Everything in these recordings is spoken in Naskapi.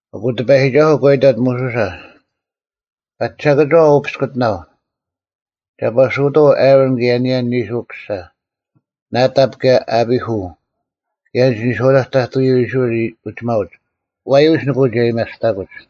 ᐊᑯ ᑎᐸᔨᒋᒐᓱᐤ ᒂ ᐃᑕᑦ ᒧᓱᓴ, “ᐸᒋ ᓴᑭᒋᐛ ᐅ ᐱᔅᑯᑎᓇᐤ, ᒐ ᐸᓱᐅᑥᐤ ᐊᕋᓐ ᑭᔭ ᐊᓂᔭ ᓂᓱ ᐅᑯᓴ, ᓇᑕᑉ ᑭᔭ ᐊᐱᐦᐅ ᑭᔭ ᐊᓐᒡ ᓂᔄᐅᑕᒡ ᑕᑐᔪᐤ ᐃᔅᕋᐃᓪ ᐅᒋᒪᐅᒡ᙮ ᐛᔪᐎᔅ ᓂᑭ ᐅᒋ ᐊᔭᒥᐊᔅᑕᑯᒡ᙮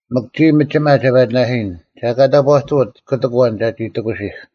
ᒥᒄ ᒋᔾ ᒥᒋᒪ ᒐ ᐸᒋᓇᓯᔨᓐ, ᒐ ᐊᑲ ᑕᑈᑐᐅᑦ ᑯᑎᒃ ᐊᐛᓐ ᒐᒋ ᑎᑯᓯᐧᒄ᙮”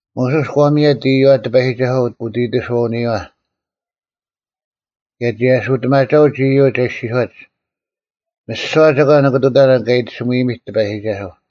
ᒧᓱᔅ ᒂ ᒥᔭᑦ ᐃᔪᐛ ᑎᐸᔨᒋᒐᓱᐛ ᐅᑦ ᐃᑎᓱᐛᐅᓂᔪᐛ, ᑭᔭ ᒋ ᐊᓱᑎᒪᒐᐅᒡ ᐃᔪᒡ ᐊ ᐃᔅᒋᔄᒡ, “ᒥᓯᐛ ᒐᒂᓐ ᓂᑭ ᑐᑕᓇᓐ ᑲ ᐃᑎᓱᒥᔨᒥᑦ ᑎᐸᔨᒋᒐᓱᐤ!”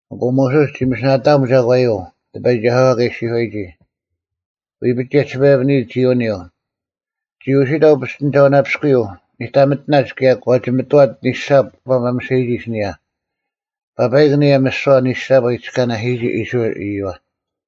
ᐊᑯ ᒧᓱᔅ ᒋ ᒥᓯᓇᑕᐊᒻ ᒐᒂᔪᐤ ᑎᐸᔨᒋᒐᓱᐛ ᑲ ᐃᔅᒋᔄᔨᒋ᙮ ᐎᐱᒡ ᒋᔭᒋᓴᐸᔭᐱᓂᔨᒡ ᒋ ᐅᓂᔪᐤ᙮ ᒋ ᐅᓯᑕᐤ ᐱᔅᑎᓂᒐᐅᓇᐱᔅᑯᔪᐤ ᓂᑕᒥᑎᓇᒡ ᑭᔭ ᒂ ᒋᒥᑐᐛᑦ ᓂᓴᑉ ᐊ ᒪᒥᓴᔨᒋ ᐊᓯᓂᔭ, ᐸᐸᐃᒄ ᐊᓂᔭ ᒥᓯᐛ ᓂᓴᑉ ᐊ ᐃᑎᔅᑲᓇᓯᔨᒋ ᐃᔅᕋᐃᓪ ᐃᔪᐛ᙮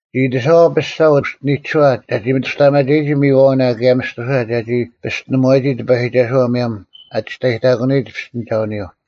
ᒋ ᐃᑎᓴᐛᐤ ᐱᔅᒐ ᐅᔅᒋᓂᒋᓱᐛ ᒐᒋ ᒥᑐᔅᑕᐊᒪᒐᔨᒋ ᒥᔨᐛᐅᓇ ᑭᔭ ᒥᔅᑐᓴ ᒐᒋ ᐱᔅᑎᓂᒧᐛᔨᒋ ᑎᐸᔨᒋᒐᓱᐛ ᒧᔭᒻ ᐊ ᒋᔅᑕᔨᑕᑯᓂᔨᒡ ᐱᔅᑎᓂᒐᐅᓂᔪᐤ᙮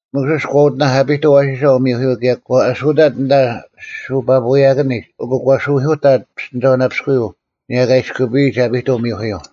ᒧᓱᔅ ᒂ ᐅᑎᓇᐧᒄ ᐊᐱᑐᐤ ᐊᐛᓯᓴ ᐅᒥᐧᑯᔪᐤ ᑭᔭ ᒂ ᐊᓱᑕᑦ ᐊᓐᑕ ᓱᐸᐳᐎᔭᑭᓂᒡ ᐊᑯ ᒂ ᓱᐎᐧᑯᑕᑦ ᐱᔅᑎᓂᒐᐅᓇᐱᔅᑯᔪᐤ ᐊᓂᔭ ᑲ ᐃᔅᑯᐱᔨᒡ ᐊᐱᑐᐤ ᒥᐧᑯᔪᐤ᙮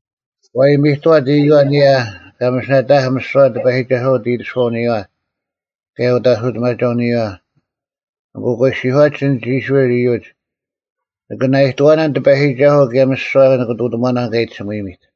ᒂ ᐃᔨᒥᑐᐛᑦ ᐃᔪᐛ ᐊᓂᔭ ᑲ ᒥᓯᓇᑕᐊᐧᒃ ᒥᓯᐛ ᑎᐸᔨᒋᒐᓱᐛ ᐅᑦ ᐃᑎᓱᐛᐅᓂᔨᐛ ᑭᔭ ᐅᑦ ᐊᓱᑎᒪᒐᐅᓂᔨᐛ, ᐊᑯ ᒂ ᐃᔅᒋᔄᒡ ᐊᓐᒡ ᐃᔅᕋᐃᓪ ᐃᔪᒡ, “ᓂᑭ ᓇᐃᑐᐛᓇᓐ ᑎᐸᔨᒋᒐᓱᐤ ᑭᔭ ᒥᓯᐛ ᓂᑭ ᐃᑐᑎᒺᓇᓐ ᑲ ᐃᑎᓱᒥᔨᒥᑦ!”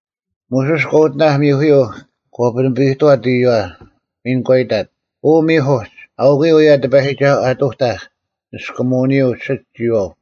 ᒧᓱᔅ ᒂ ᐅᑎᓇᐧᒃ ᒥᐧᑯᔪᐤ ᒂ ᐱᓂᐱᔨᑐᐛᑦ ᐃᔪᐛ᙮ ᒥᓐ ᒂ ᐃᑕᑦ, “ᐅ ᒥᐧᒄ ᐅᒡ, ᐊᐅᑯᔪᐤ ᐅᔭ ᑎᐸᔨᒋᒐᓱᐤ ᐊᑐᑕᐧᒃ ᓂᔅᑯᒧᐅᓂᔪᐤ ᓯᒡ ᒋᔨᐛᐤ᙮”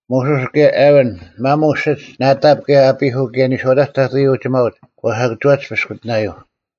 ᒧᓱᔅ ᑭᔭ ᐊᕋᓐ, ᒪᒧᐤ ᓯᒡ ᓇᑕᑉ ᑭᔭ ᐊᐱᐦᐅ ᑭᔭ ᓂᔄᐅᑕᒡ ᑕᑐᔪᐤ ᐃᔅᕋᐃᓪ ᐅᒋᒪᐅᒡ ᒂ ᓴᑭᒋᐛᒡ ᐱᔅᑯᑎᓇᔪᐤ᙮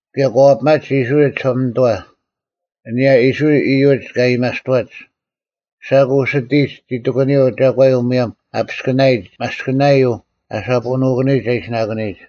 ᑭᔭ ᒂ ᐛᐱᒪᒡ ᐃᔅᕋᐃᓪ ᒋᓴᒪᓂᑐᐛ, ᐊᓂᔭ ᐃᔅᕋᐃᓪ ᐃᔪᒡ ᑲ ᐊᔭᒥᐊᔅᑐᐛᒡ᙮ ᓴᑯ ᐅᓯᑎᔨᒡ ᒋᑎᑯᓂᔪᐤ ᒐᒂᔪᐤ ᒧᔭᒻ ᐊ ᐱᔅᑭᓇᔨᒡ ᒪᔅᑭᓇᔪᐤ ᐊ ᓴᐳᓄᑯᓂᔨᒡ ᐊ ᐃᓯᓇᑯᓂᔨᒡ᙮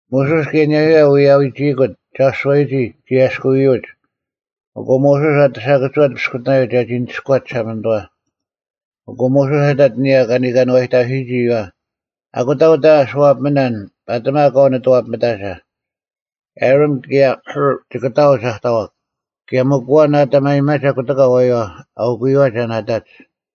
ᒧᓱᔅ ᑭᔭ ᐊᓂᔭᔪᐛ ᐎᔭᐎᒋᐃᑯᑦ ᒐᓱᐛᔨᒋ ᒋ ᐊᔭᔅᑯᐎᔪᒡ᙮ ᐊᑯ ᒧᓱᔅ ᐊᑎ ᓴᑭᒋᐛᑦ ᐱᔅᑯᑎᓇᔪᐤ ᒐᒋ ᓂᒋᔅᑯᐛᑦ ᒋᓴᒪᓂᑐᐛ᙮ ᐊᑯ ᒧᓱᔅ ᐊᑕᑦ ᐊᓂᔭ ᐃᔅᕋᐃᓪ ᐅᒋᒪᐛ, “ᐊᑯᑕ ᐅᑕ ᐊᓱᐛᐱᒥᓇᓐ ᐸᑎᒪ ᑲᐤ ᓂᑐᐛᐱᒥᑕᒐ᙮ ᐊᕋᓐ ᑭᔭ ᐦᐅᕐ ᒋᑭ ᑕᐅᒡ ᐊ ᑕᐛᒄ, ᑭᔭ ᒥᒄ ᐊᐛᓐ ᐊᑕᒪᔨᒪᒐ ᑯᑎᑲ ᐊᐛᔪᐛ, ᐊᐅᑯᔪᐛ ᒐ ᓇᑕᒡ᙮”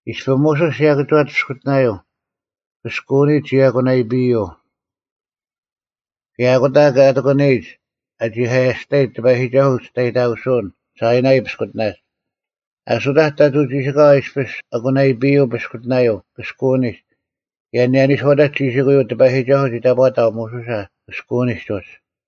ᐃᔅᐱ ᒧᓱᔅ ᓯᔭᑭᒋᐛᑦ ᐱᔅᑯᑎᓇᔪᐤ, ᑭᔅᑯᐅᓂᒡ ᒋ ᐊᑯᓇᐃᐱᔪᐤ᙮ ᑭᔭ ᐊᑯᑕ ᑲ ᑎᑯᓂᔨᒡ ᐊ ᒋᐧᑲᔭᔅᑕᔨᒡ ᑎᐸᔨᒋᒐᓱᐤ ᐅᒋᔅᑕᔨᑕᑯᓱᐅᓐ ᓴᐃᓇᐃ ᐱᔅᑯᑎᓇᒡ᙮ ᐊᓱᑕᒡ ᑕᑐᐤ ᒋᓯᑲᐛ ᐃᔅᐱᔅ ᐊᑯᓇᐃᐱᔪᐤ ᐱᔅᑯᑎᓇᔪᐤ ᑭᔅᑯᐅᓂᒡ ᑭᔭ ᐊᓂᔭ ᓂᔄᐅᑕᒡ ᒋᓯᑯᔪᐤ ᑎᐸᔨᒋᒐᓱᐤ ᒋ ᑕᑈᑕᐤ ᒧᓱᓴ ᑭᔅᑯᐅᓂᒡ ᐅᒡ᙮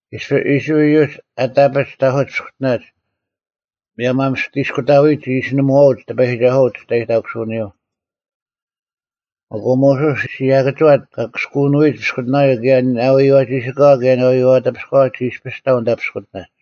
ᐃᔅᐱ ᐃᔅᕋᐃᓪ ᐃᔪᒡ ᐊᑕᐱᒡ ᑕᐧᑯᒡ ᐱᔅᑯᑎᓇᒡ, ᒧᔭᒻ ᐊ ᒥᔅᑎ ᐃᔅᑯᑕᔨᒡ ᒋ ᐃᓯᓂᒧᐛᐅᒡ ᑎᐸᔨᒋᒐᓱᐛ ᐅᒋᔅᑕᔨᑕᑯᓱᐅᓂᔪᐤ᙮ ᐊᑯ ᒧᓱᔅ ᓯᔭᑭᒋᐛᑦ ᑲ ᑭᔅᑯᐅᓄᐎᒡ ᐱᔅᑯᑎᓇᔪᐤ ᑭᔭ ᓇᐎᔪᐛ ᒋᓯᑲᐛ ᑭᔭ ᓇᐎᔪᐛ ᑎᐱᔅᑲᐛ ᒋ ᐃᔅᐱᔅ ᑕᐤ ᐊᓐᑕ ᐱᔅᑯᑎᓇᒡ᙮